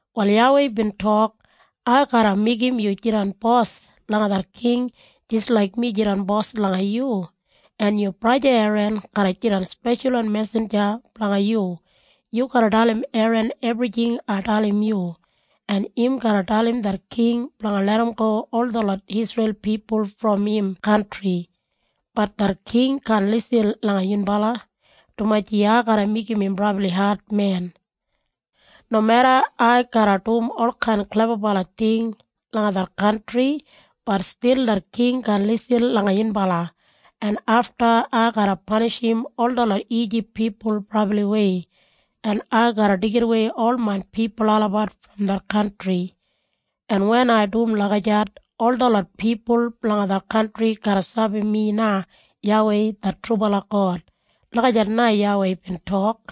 Wal YAWEI bin tok, “Ai garra meigim yu jidan bos langa det king jis laik mi jidan bos langa yu, en yu braja Eran garra jidan speshalwan mesinja blanga yu. Yu garra dalim Eran ebrijing ai dalim yu, en im garra dalim det king blanga larramgo ol detlot Isreil pipul brom im kantri. Bat det king kaan lisin langa yunbala, dumaji ai garra meigim im brabli admen. Nomeda ai garra dum olkain klebabala ting langa det kantri, bat stil det king kaan lisin langa yunbala, en afta ai garra panishim ol detlot Ijip pipul brabliwei, en ai garra deigidawei ol main pipul olabat brom det kantri. En wen ai dum lagijat, ol detlot pipul blanga det kantri garra sabi mi na YAWEI det trubala God.” Lagijat na YAWEI bin tok.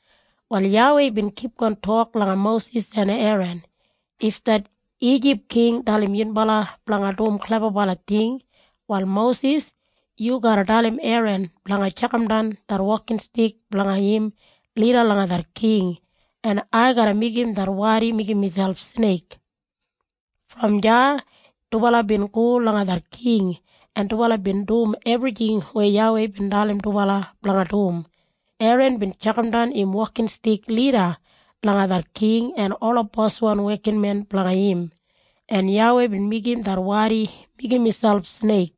Wal YAWEI bin kipgon tok langa Mosis en Eran, “If det Ijip king dalim yunbala blanga dum klebabala ting, wal Mosis, yu garra dalim Eran blanga tjakamdan det wokinstik blanga im lida langa det king, en ai garra meigim det wadi meigim miselp sneik.” Brom deya dubala bin go langa det king, en dubala bin dum ebrijing weya YAWEI bin dalim dubala blanga dum. Eran bin tjakamdan im wokinstik lida langa det king en ola boswan wekinmen blanga im, en YAWEI bin meigim det wadi meigim miselp sneik.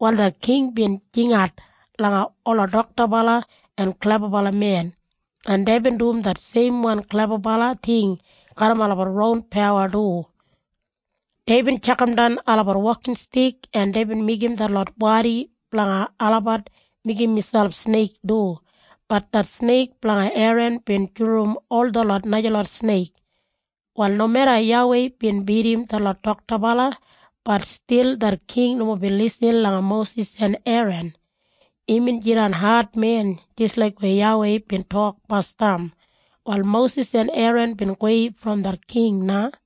Wal det king bin jingat langa ola doktabala en klebabalamen, en deibin dum det seimwan klebabala ting garram olabat ron pawa du. Deibin tjakamdan olabat wokinstik, en deibin meigim detlot wadi blanga olabat meigim miselp sneik du. Bat det sneik blanga Eran bin julurum ol detlot najalot sneik. Wal nomeda YAWEI bin bidim detlot doktabala, bat stil det king nomo bin lisin langa Mosis en Eran. Imbin jidan admen jis laik weya YAWEI bin tok basdam. Wal Mosis en Eran bin gowei brom det king na.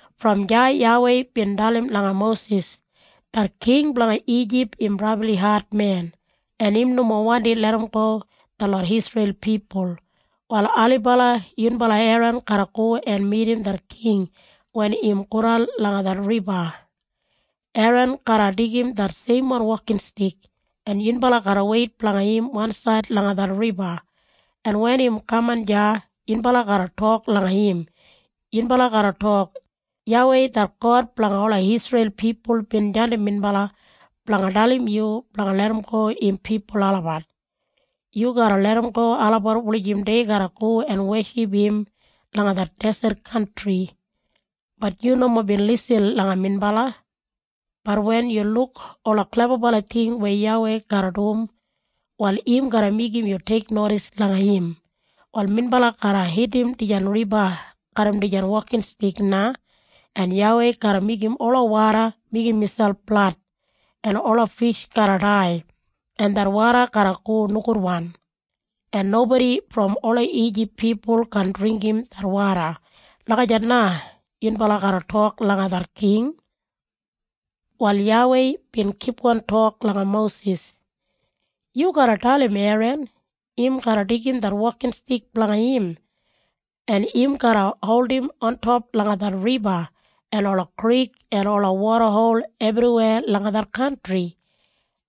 Brom deya YAWEI bin dalim langa Mosis, “Det king blanga Ijip im brabli admen, en im nomo wandi larramgo detlot Isreil pipul. Wal ailibala yunbala Eran garra go en midim det king wen im godan langa det riba. Eran garra deigim det seimwan wokinstik, en yunbala garra weit blanga im wansaid langa det riba, en wen im kaman deya, yunbala garra tok langa im. Yunbala garra tok, ‘YAWEI det God blanga ola Isreil pipul bin jandim minbala blanga dalim yu blanga larramgo im pipul olabat. Yu garra larramgo olabat wulijim dei garra go en weship im langa det deset kantri. Bat yu nomo bin lisin langa minbala. Bat wen yu luk ola klebabala ting weya YAWEI garra dum, wal im garra meigim yu teiknodis langa im. Wal minbala garra hitim dijan riba garram dijan wokinstik na, en YAWEI garra meigim ola woda meigim miselp blad, en ola fish garra dai, en det woda garra go nogudwan, en nobodi brom ola Ijip pipul kaan dringgim det woda.’ Lagijat na yunbala garra tok langa det king.” Wal YAWEI bin kipgon tok langa Mosis, “Yu garra dalim Eran im garra deigim det wokinstik blanga im, en im garra holdim ontop langa det riba en ola krik en ola wodahol ebriweya langa det kantri.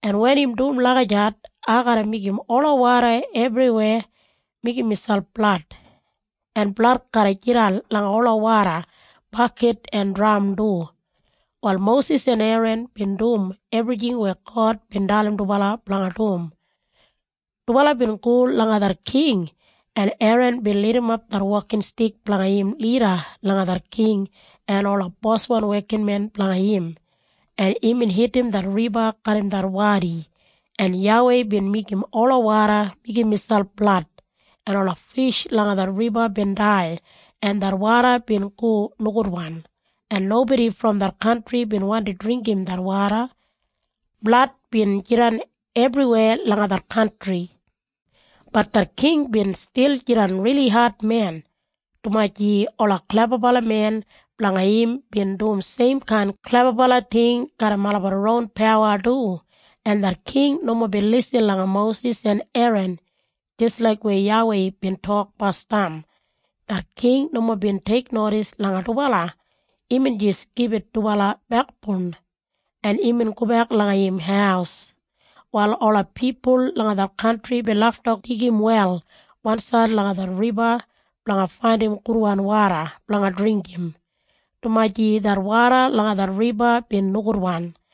En wen im dum lagijat, ai garra meigim ola woda ebriweya meigim miselp blad, en blad garra jidan langa ola woda bakit en dram du.” Wal Mosis en Eran bin dum ebrijing weya God bin dalim dubala blanga dum. Dubala bin go langa det king, en Eran bin lidimap det wokinstik blanga im lida langa det king en ola boswan wekinmen blanga im, en imbin hitim det riba garram det wadi, en YAWEI bin meigim ola woda meigim miselp blad, en ola fish langa det riba bin dai, en det woda bin go nogudwan, en nobodi brom det kantri bin wandi dringgim det woda. Blad bin jidan ebriweya langa det kantri. Bat det king bin stil jidan rili admen, dumaji ola klebabalamen blanga im bin dum seimkain klebabala ting garram olabat ron pawa du. En det king nomo bin lisin langa Mosis en Eran jis laik weya YAWEI bin tok basdam. Det king nomo bin teiknodis langa dubala. Imbin jis gibit dubala bekboun, en imbin gobek langa im haus. Wal ola pipul langa det kantri bin lafta digim wel wansaid langa det riba blanga faindim gudwan woda blanga dringgim, dumaji det woda langa det riba bin nogudwan.